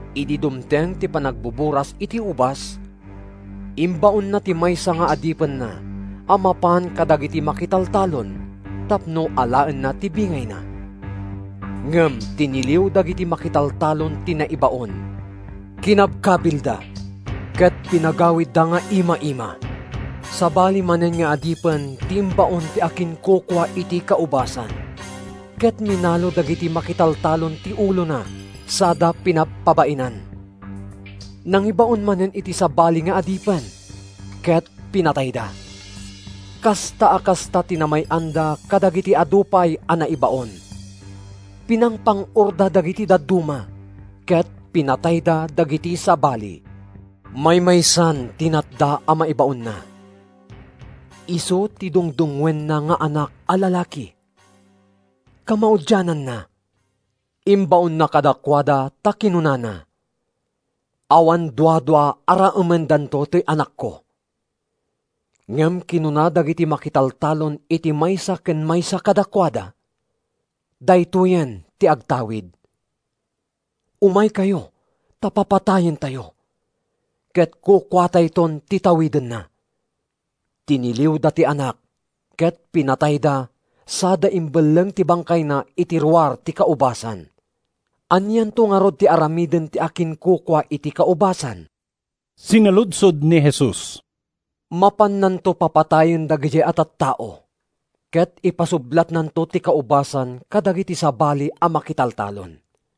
“Idi dumteng ti panagbuburas iti ubas, imbaonna ti maysa nga adipenna a mapan kadagiti makitaltalon tapno alaenna ti bingayna. Ngem tiniliw dagiti makitaltalon ti naibaon, kinabkabilda, ket pinagawidda nga ima-ima. “Sabali manen nga adipen ti imbaon ti akinkukua iti kaubasan, ket minalo dagiti makitaltalon ti ulona sada pinabpabainan. “Nangibaon manen iti sabali nga adipen, ket pinatayda. Kasta a kasta ti namay-anda kadagiti adu pay a naibaon. Pinangpang-orda dagiti dadduma, ket pinatayda dagiti sabali. Maymaysan ti natda a maibaonna. Isu ti dungdungngoenna nga anak a lalaki. Kamaudiananna, imbaonna kadakuada ta kinunana, ‘Awan duadua a raemendanto toy anakko.’ Ngem kinuna dagiti makitaltalon iti maysa ken maysa kadakuada, ‘Daytoyen ti agtawid. Umaykayo ta papatayentayo, ket kukuatayton ti tawidenna!’ “Tiniliwda ti anak ket pinatayda sada imbelleng ti bangkayna iti ruar ti kaubasan. “Anianto ngarud ti aramiden ti akinkukua iti kaubasan?” sinaludsod ni Jesus. “Mapannanto papatayen dagidiay a tattao ket ipasublatnanto ti kaubasan kadagiti sabali a makitaltalon.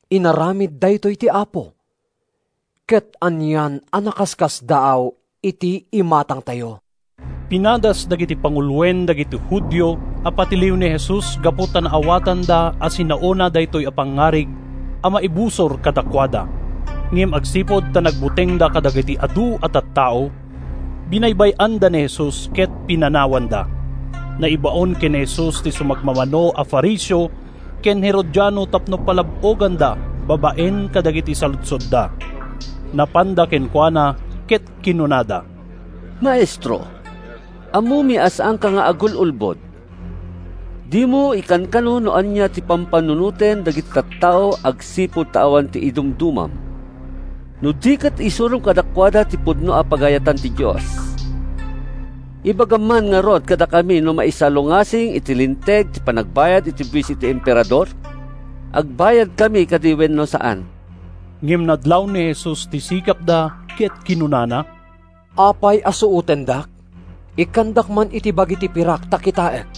Inaramid daytoy ti Apo, Ket anian a nakaskasdaaw iti imatangtayo!’” Pinadas dagiti panguloen dagiti Judio a patiliw ni Jesus gapu ta naawatanda a sinaona daytoy a pangngarig a maibusor kadakuada. Ngem agsipud ta nagbutengda kadagiti adu a tattao, binaybay-anda ni Jesus ket pinanawanda. Naibaon ken ni Jesus ti sumagmamano a Fariseo ken Herodiano tapno palab-oganda babaen kadagiti saludsodda. Napanda kenkuana ket kinunada, “Maestro, ammomi a saanka nga agul-ulbod. Dimo ikankano no ania ti pampanunoten dagiti tattao agsipud ta awan idumdumam, no di ket isurom kadakuada ti pudno a pagayatan ti Dios. Ibagam man ngarud kadakami no maisalungasing iti Linteg ti panagbayad iti buis iti Emperador? Agbayadkami kadi wenno saan?” Ngem nadlaw ni Jesus ti sikapda ket kinunana, “Apay a suotendak? Ikkandak man iti bagi ti pirak ta kitaek.”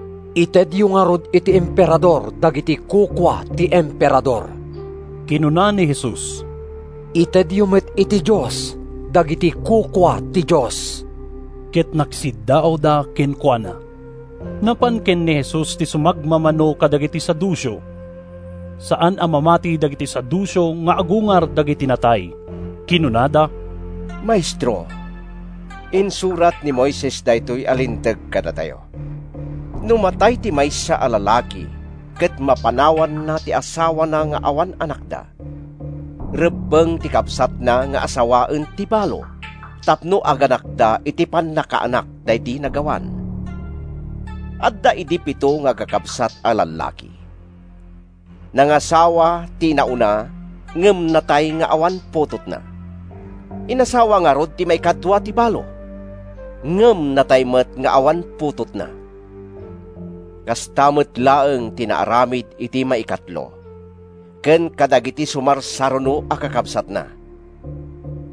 “Itedyo ngarud iti Emperador dagiti kukua ti Emperador,” kinuna ni Jesus. “Itedyo met iti Dios dagiti kukua ti Dios.” Ket nagsiddaawda kenkuana. Napan ken ni Jesus ti sumagmamano kadagiti Saduceo. (Saan a mamati dagiti Saduceo nga agungar dagiti natay.) Kinunada, “Maestro, insurat ni Moises daytoy a linteg kadatayo, ‘No matay ti maysa a lalaki ket mapanawanna ti asawana nga awan anakda, rebbeng ti kabsatna nga asawaen ti balo tapno aganakda iti pannakaanak daydi nagawan.’ “Adda idi pito nga agkakabsat a lallaki. Nangasawa ti inauna ngem natay nga awan putotna. Inasawa ngarud ti maikadua ti balo, ngem natay met nga awan putotna. Kasta met laeng ti naaramid iti maikatlo, ken kadagiti sumarsaruno a kakabsatna.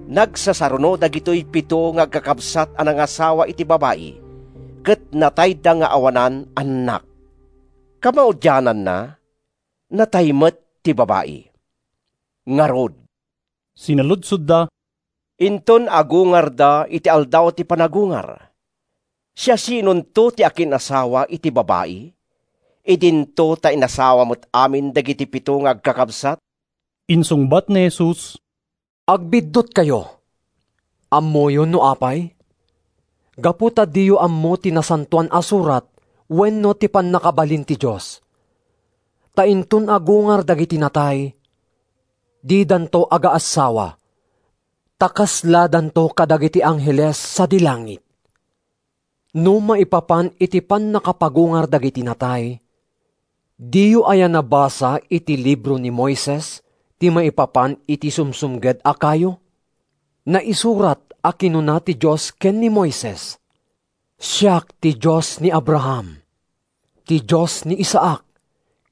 Nagsasaruno dagitoy pito nga agkakabsat a nangasawa iti babai ket natayda nga awanan annak. Kamaudiananna, natay met ti babai. “Ngarud,” sinaludsodda, “inton agungarda iti aldaw ti panagungar, siasinonto ti akin-asawa iti babai, idinto ta inasawa met amin dagiti pito nga agkakabsat?” Insungbat ni Jesus, “Agbiddutkayo. Ammoyo no apay? Gapu ta diyo ammo ti Nasantoan a Surat wenno ti pannakabalin ti Dios. Ta inton agungar dagiti natay, didanto agaassawa, ta kasladanto kadagiti angheles sadi langit. No maipapan iti pannakapagungar dagiti natay, diyo aya nabasa iti Libro ni Moises ti maipapan iti sumsumged a kayo? Naisurat a kinuna ti Dios ken ni Moises, ‘Siak ti Dios ni Abraham, ti Dios ni Isaac,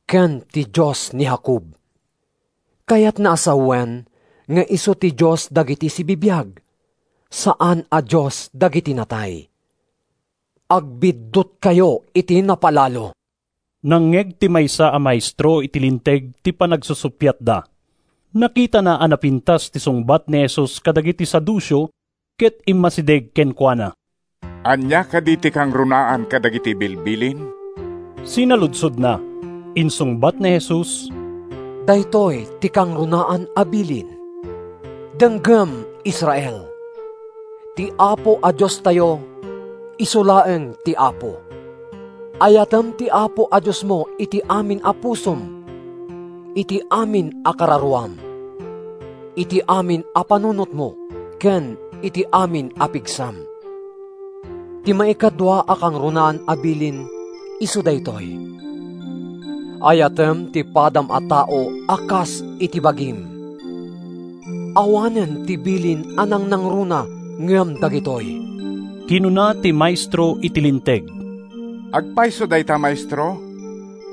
ken ti Dios ni Jacob.’ Kayatna a sawen nga isu ti Dios dagiti sibibiag, saan a Dios dagiti natay. Agbiddutkayo iti napalalo.” Nangngeg ti maysa a maestro iti Linteg ti panagsusuppiatda. Nakitana a napintas ti sungbat ni Jesus kadagiti Saduceo, ket immasideg kenkuana. “Ania kadi ti kangrunaan kadagiti bilbilin?” sinaludsodna. Insungbat ni Jesus, “Daytoy ti kangrunaan a bilin, ‘Denggem, Israel! Ti Apo a Diostayo isu laeng ti Apo. Ayatem ti Apo a Diosmo iti amin a pusom, iti amin a kararuam, iti amin a panunotmo ken iti amin a pigsam.’ Ti maikadua a kangrunaan a bilin isu daytoy: ‘Ayatem ti padam a tao a kas iti bagim.’ Awanen ti bilin a nangnangruna ngem dagitoy.” Kinuna ti maestro iti Linteg. “Agpayso dayta, Maestro.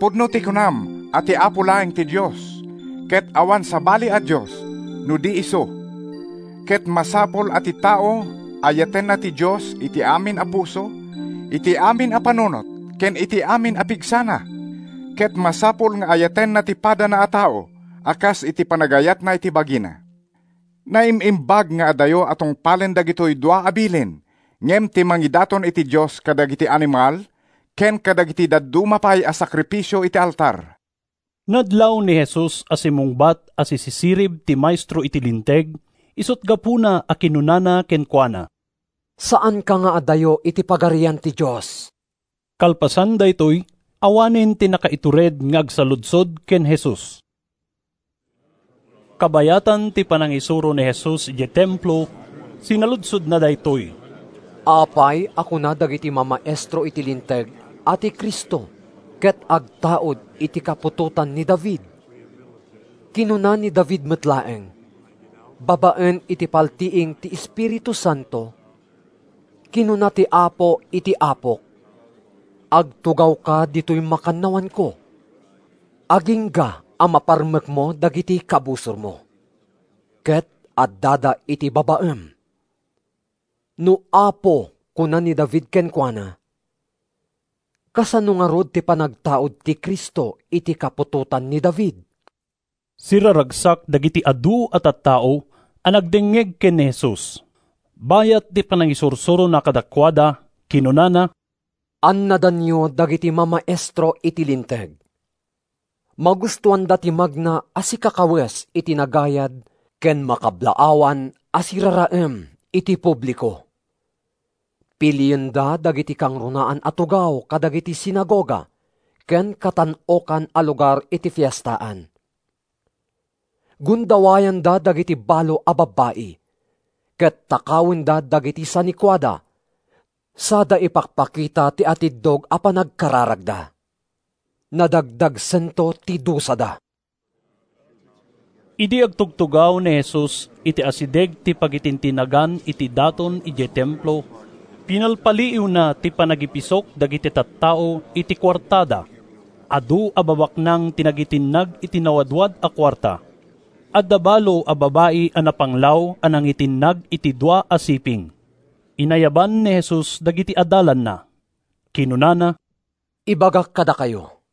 Pudno ti kunam a ti Apo laeng ti Dios, ket awan sabali a dios no di isu. Ket masapul a ti tao ayatenna ti Dios iti amin a puso, iti amin a panunot ken iti amin a pigsana; ket masapul nga ayatenna ti padana a tao a kas iti panagayatna iti bagina. Naim-imbag nga adayo a tungpalen dagitoy dua a bilin ngem ti mangidaton iti Dios kadagiti animal ken kadagiti dadduma pay a sakrifisio iti altar.” Nadlaw ni Jesus a simmungbat a sisisirib ti maestro iti Linteg, isut’ gapuna a kinunana kenkuana, “Saanka nga adayo iti Pagarian ti Dios.” Kalpasan daytoy, awanen ti nakaitured nga agsaludsod ken Jesus. Kabayatan ti panangisuro ni Jesus idiay Templo, sinaludsodna daytoy: “Apay a kuna dagiti mamaestro iti Linteg a ti Cristo ket agtaud iti kaputotan ni David? Kinuna ni David met laeng, babaen iti paltiing ti Espiritu Santo: ‘Kinuna ti Apo iti Apok: Agtugawka ditoy makannawanko, Agingga a maparmekko dagiti kabusormo. Ket addada iti babaem.’ No ‘Apo’ kuna ni David kenkuana, kasano ngarud ti panagtaud ti Cristo iti kaputotan ni David?” Siraragsak dagiti adu a tattao a nangdengngeg ken ni Jesus. Bayat ti panangisursurona kadakuada, kinunana: “Annadanyo dagiti mamaestro iti Linteg. Magustoanda ti magna a sikakawes iti nagayad ken makablaawan a siraraem iti publiko. Pilienda dagiti kangrunaan a tugaw kadagiti sinagoga ken katan-okan a lugar iti fiestaan. Gundawayanda dagiti balo a babbai, ket takawenda dagiti sanikuada sada ipakpakita ti atiddog a panagkararagda. Nadagdagsento ti dusada.” Idi agtugtugaw ni Jesus iti asideg ti pagitintinnagan iti daton idiay Templo, pinalpaliiwna ti panagipisok dagiti tattao iti kuartada. Adu a babaknang ti nagitinnag iti nawadwad a kuarta. Adda balo a babai a napanglaw a nangitinnag iti dua a siping. Inayaban ni Jesus dagiti adalanna. Kinunana, “Ibagak kadakayo,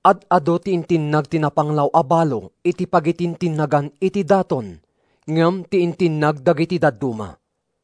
ad-adu ti intinnag ti napanglaw a balo iti pagitintinnagan iti daton ngem ti intinnag dagiti dadduma.